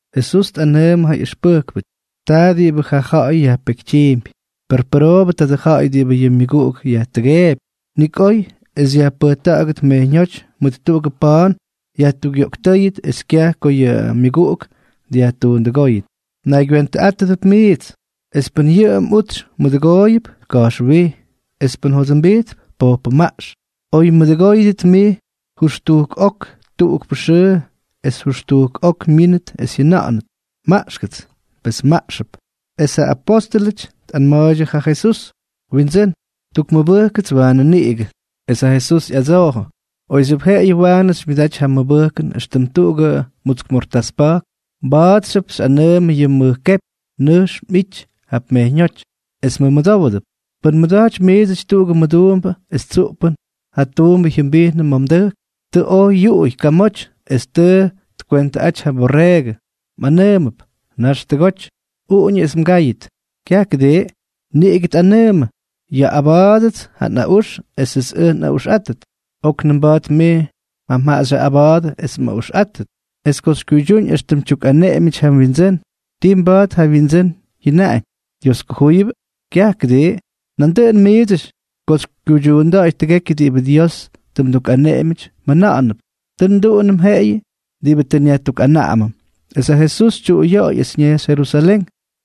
Jesús tꞌanʉʉmʉ ja ꞌyʉxpʉjkpʉty: —Taa diꞌibʉ ja ja̱ꞌa̱y yajpekytyiimpy. ¡Per pʉroobʉ tadʉ ja̱ꞌa̱y diꞌibʉ yʉ myʉguꞌuk yajtʉgeepy! Nik oy es yajpʉjta̱ꞌa̱gʉt mejyñóty mʉt tuꞌugʉ pa̱a̱n yajtukꞌyoꞌktʉ́yʉt es kyaj ko yʉ myʉguꞌuk dyajtuundʉgóy. ’Mnaygywentʉꞌátʉdʉp mijts. Es pʉn yʉ mꞌutsy mmʉdʉgooyʉp, ka̱jxwij. Es pʉn jodʉmbijtp, pojpʉmaꞌx. Oy mmʉdʉgóyʉdʉt mij jʉxtujk ok tuꞌukpʉ xʉʉ es jʉxtujk ok myínʉt es jyʉna̱ꞌa̱nʉt: “Maꞌxkʉts”, pes mmaꞌxʉp. Es ja apóstʉlʉty tꞌanma̱a̱ydyʉ ja Jesús: —Windsʉ́n, tukmʉbʉjkʉts waanʉ niꞌigʉ. Es ja Jesús ꞌyadsoojʉ: —Oyxyʉp jeꞌeyʉ waanʉ xymyʉdaty ja mʉbʉjkʉn éxtʉm tuꞌugʉ mutsk mortás pa̱jk, mba̱a̱txyʉp xyꞌanʉʉmʉ yʉ mʉj kepy: “Nʉjx mꞌity jap mejyñóty”, es mmʉmʉdówʉdʉp. ’Pʉn mmʉda̱jtypy miidsʉty tuꞌugʉ mduumbʉ es tsuꞌpʉn ja tuumbʉ jyʉmbijnʉ ma̱ mdʉjk, tʉ oj yuꞌuy kamoty o tʉ tkwentʉꞌaty ja mborreegʉ, mꞌanʉʉmʉp: “Nax tʉgoty. Uꞌuñʉ es mgáyʉt.” Kyaj, ¿kʉdii? Niꞌigʉ tꞌanʉʉmʉ: “Yaꞌꞌaba̱a̱dʉts ja nꞌaꞌux esʉts ʉj nꞌaꞌuxꞌátʉt. Oknʉm mba̱a̱t mij mjaꞌa xyaꞌꞌaba̱a̱dʉ es mꞌaꞌuxꞌátʉt.” Es ko tkuydyúñ éxtʉm tyukꞌaneꞌemyʉty ja wyindsʉ́n, ¿ti mba̱a̱t ja wyindsʉ́n jyʉnaꞌañ: “Dios kujúyʉbʉ?” Kyaj, ¿kʉdii? Nandʉꞌʉn miidsʉty ko xykyuydyuunda̱ꞌa̱y tʉgekyʉ diꞌibʉ Dios tʉ mdukꞌaneꞌemyʉty, mjʉna̱ꞌa̱ndʉp: “Tʉ nduꞌunʉm jeꞌeyʉ diꞌibʉ tʉ nyajtukꞌanaꞌamʉm.” Es ja Jesús tyuꞌuyoꞌoy es ñejxy Jerusalén.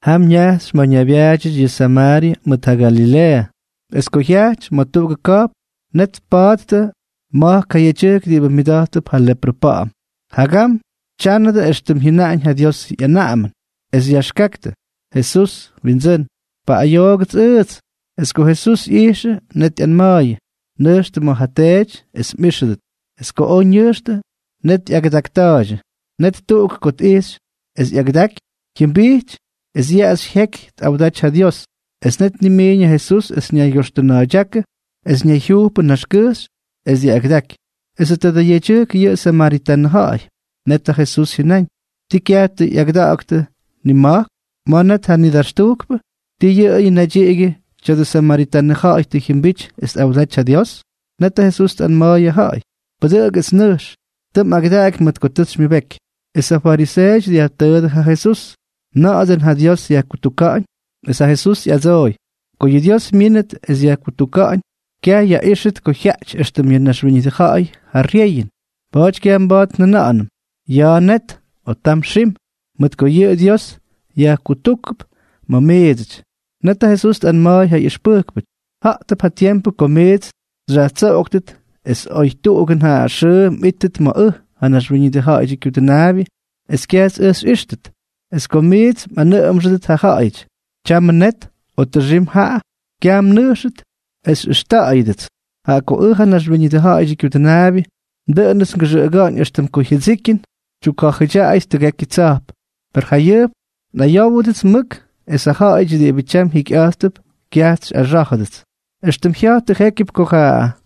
Jam ñajxy ma̱ ñaybyaadyʉty yʉ Samaaryʉ mʉt ja Galileeʉ. Es ko jyajty ma̱ tuꞌugʉ ka̱jpn, net tpattʉ ma̱jk ja yedyʉjk diꞌibʉ myʉda̱jttʉp ja leprʉ pa̱ꞌa̱m. Jagam ja tyánʉdʉ éxtʉm jyʉnaꞌañ ja Diosʉ ꞌyanaꞌamʉn, es yaxkaktʉ: —Jesús, Windsʉ́n, paꞌꞌayoogʉts ʉʉdsʉty. Es ko Jesús ꞌyijxʉ, net ꞌyanma̱a̱yʉ: —Nʉjxtʉ ma̱ ja teety es mꞌíxʉdʉt. Es ko oj ñʉjxtʉ, net ꞌyagʉdakta̱a̱ydyʉ. Net tuꞌuk ko tꞌijxy es tʉ ꞌyagʉdaꞌaky, jyʉmbijty es yaꞌaxy jyeky tꞌawda̱jty ja Dios. Es net tnimiiñ ja Jesús es ñaygyoxtʉna̱a̱ydyákʉ es ñayjyujpʉ naxkʉjxy es tja̱ꞌa̱ygyʉdáky. Esʉ tadʉ yedyʉjk yʉꞌʉ samaritanʉ ja̱ꞌa̱y. Net ja Jesús jyʉnáñ: —¿Tii kyaj tʉ ꞌyagʉda̱ꞌa̱ktʉ nima̱jk? ¿Ma̱ net ja nidaxtujkpʉ? ¿Tii yʉꞌʉyʉ naydyiꞌigyʉ tya̱dʉ samaritanʉ ja̱ꞌa̱y tʉ jyʉmbity es tꞌawdaty ja Dios? Net ja Jesús tꞌanma̱a̱y ja ja̱ꞌa̱y: —Pʉdʉꞌʉk es nʉjx. Tʉ mꞌagʉdaꞌaky mʉt ko tʉ xymyʉbeky. Es ja fariseeʉty dyajtʉʉdʉ ja Jesús: —¿Na̱ꞌa̱ dʉꞌʉn ja Dios yajkutuka̱ꞌa̱ñ? Es ja Jesús ꞌyadsooy: —Ko yʉ Dios myínʉt es yajkutuka̱ꞌa̱ñ, kyaj yaꞌíxʉt ko jyaꞌty éxtʉm yʉ naxwíñʉdʉ ja̱ꞌa̱y ja ryeyʉn. Pa̱a̱ty kyaj mba̱a̱t njʉna̱ꞌa̱nʉm: “Ya̱a̱ net”, o “Tam xim”, mʉt ko yʉ Dios yajkutujkp ma̱ miidsʉty. Net ja Jesús tꞌanma̱a̱y ja ꞌyʉxpʉjkpʉty: —Ja̱ꞌtʉp ja tiempʉ ko miits xyjatsóktʉt es oy tuꞌugʉn ja xʉʉ mꞌítʉt ma̱ ʉj, ja Naxwíñʉdʉ Ja̱ꞌa̱yʉdyʉ Kyudʉnaabyʉ, es kyajts ʉj xyꞌíxtʉt. Es ko miits mꞌanʉꞌʉmxʉdʉt ja ja̱ꞌa̱yʉty: “Tyamʉ net”, o “Tʉxim jaꞌa”, kyaj mnʉjxtʉt es xyꞌʉxta̱ꞌa̱yʉdʉts. Jaꞌa ko ʉj, ja Naxwíñʉdʉ Ja̱ꞌa̱yʉdyʉ Kyudʉnaabyʉ, dʉꞌʉnʉts ngʉxʉꞌʉga̱ꞌa̱ñ éxtʉm ko jyʉdsikyʉn tyukja̱jʉdyaꞌayʉt tʉgekyʉ tsa̱jp. Per jayʉjp nꞌayówʉdʉts mʉk es ja ja̱ꞌa̱yʉty diꞌibʉ tyam jikyꞌa̱jttʉp kyajts xyꞌaxá̱jʉdʉts. ’Extʉm jya̱jtʉ jékyʉp ko ja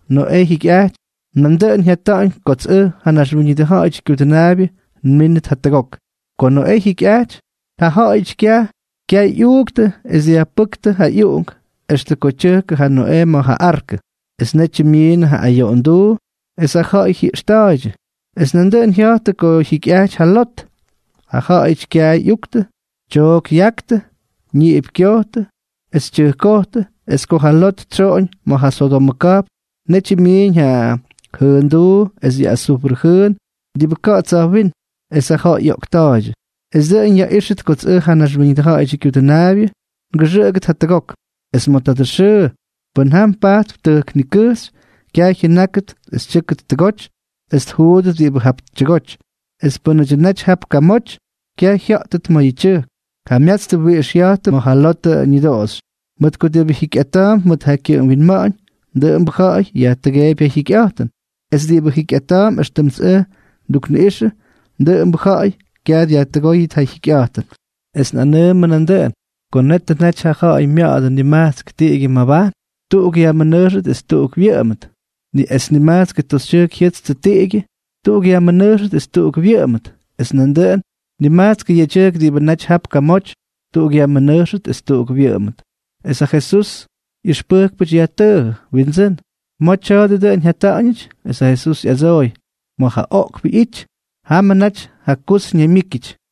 Noꞌee jyikyꞌajty, nandʉꞌʉn jyata̱ꞌa̱ñ kots ʉj, ja Naxwíñʉdʉ Ja̱ꞌa̱yʉdyʉ Kyudʉnaabyʉ, nmínʉt jatʉgok. Ko Noꞌee jyikyꞌajty, ja ja̱ꞌa̱yʉty kyay ꞌyuuktʉ es dyajpʉ́ktʉ ja ꞌyuꞌunk extʉ ko tyʉjkʉ ja Noꞌee ma̱ ja arkʉ, es netyʉ myiinnʉ ja ayoꞌonduu es ja ja̱ꞌa̱y jyiꞌxta̱a̱ydyʉ. Es nandʉꞌʉn jya̱jtʉ ko jyikyꞌajty ja Lot. Ja ja̱ꞌa̱yʉty kyay ꞌyuuktʉ, tyook yaktʉ, ñiꞌip kyojtʉ es ja tyʉjk tkojtʉ. Es ko ja Lot tsyoꞌoñ ma̱ ja Sodomʉ ka̱jpn, netyʉ myiiñ ja jʉʉnduu es yʉ azufrʉ jʉʉn diꞌibʉ ka̱ꞌa̱ tsa̱jwínm, es ja ja̱ꞌa̱y ꞌyoꞌkta̱a̱ydyʉ. Es dʉꞌʉn yaꞌíxʉt kots ʉj, ja Naxwíñʉdʉ Ja̱ꞌa̱yʉdyʉ Kyudʉnaabyʉ, ngʉxʉꞌʉgʉt jatʉgok. ’Es ma̱ tadʉ xʉʉ, pʉ́n jam pajtp tʉjk nikʉjxy, kyaj jyʉnákʉt es tyʉ́kʉt tʉgoty es tjuudʉt diꞌibʉ jap tyʉgoty. Es pʉ́nʉdyʉ naty jap kamoty, kyaj jya̱ꞌttʉt ma̱ ja tyʉjk. Jamyatstʉ wiꞌix jya̱jtʉ mʉt ja Lotʉ ñʉdoꞌoxy. Mʉt ko diꞌibʉ jikyꞌata̱a̱mp mʉt ja kyʉꞌʉm winma̱ꞌa̱ñ, dʉꞌʉmbʉ ja̱ꞌa̱y yajtʉgeepy ja jyikyꞌa̱jtʉn, es diꞌibʉ jikyꞌata̱a̱mp éxtʉmts ʉj ndukniꞌꞌixʉ, dʉꞌʉmbʉ ja̱ꞌa̱y kyaj dyajtʉgóy ja jyikyꞌa̱jtʉn. ’Es nꞌanʉʉmʉ nandʉꞌʉn ko netʉ naty ja ja̱ꞌa̱y mya̱ꞌa̱dʉ nimajtsk tiꞌigyʉ mabajn, tuꞌuk yajmʉnʉjxʉt es tuꞌuk wyʉꞌʉmʉt. Es nimajtskʉ toxytyʉjk jyʉtstʉ tiꞌigyʉ, tuꞌuk yajmʉnʉjxʉt es tuꞌuk wyʉꞌʉmʉt. Es nandʉꞌʉn nimajtskʉ yedyʉjk diꞌibʉ naty jap kamoty, tuꞌuk yajmʉnʉjxʉt es tuꞌuk wyʉꞌʉmʉt. Es ja Jesusʉ ꞌyʉxpʉjkpʉty yajtʉʉjʉ: —Windsʉ́n, ¿ma̱ tya̱a̱dʉ dʉꞌʉn jyata̱ꞌa̱ñʉty? Es ja Jesús ꞌyadsooy: —Ma̱ ja oꞌkpʉ ꞌyity, jamʉ naty ja kus ñaymyíkyʉty.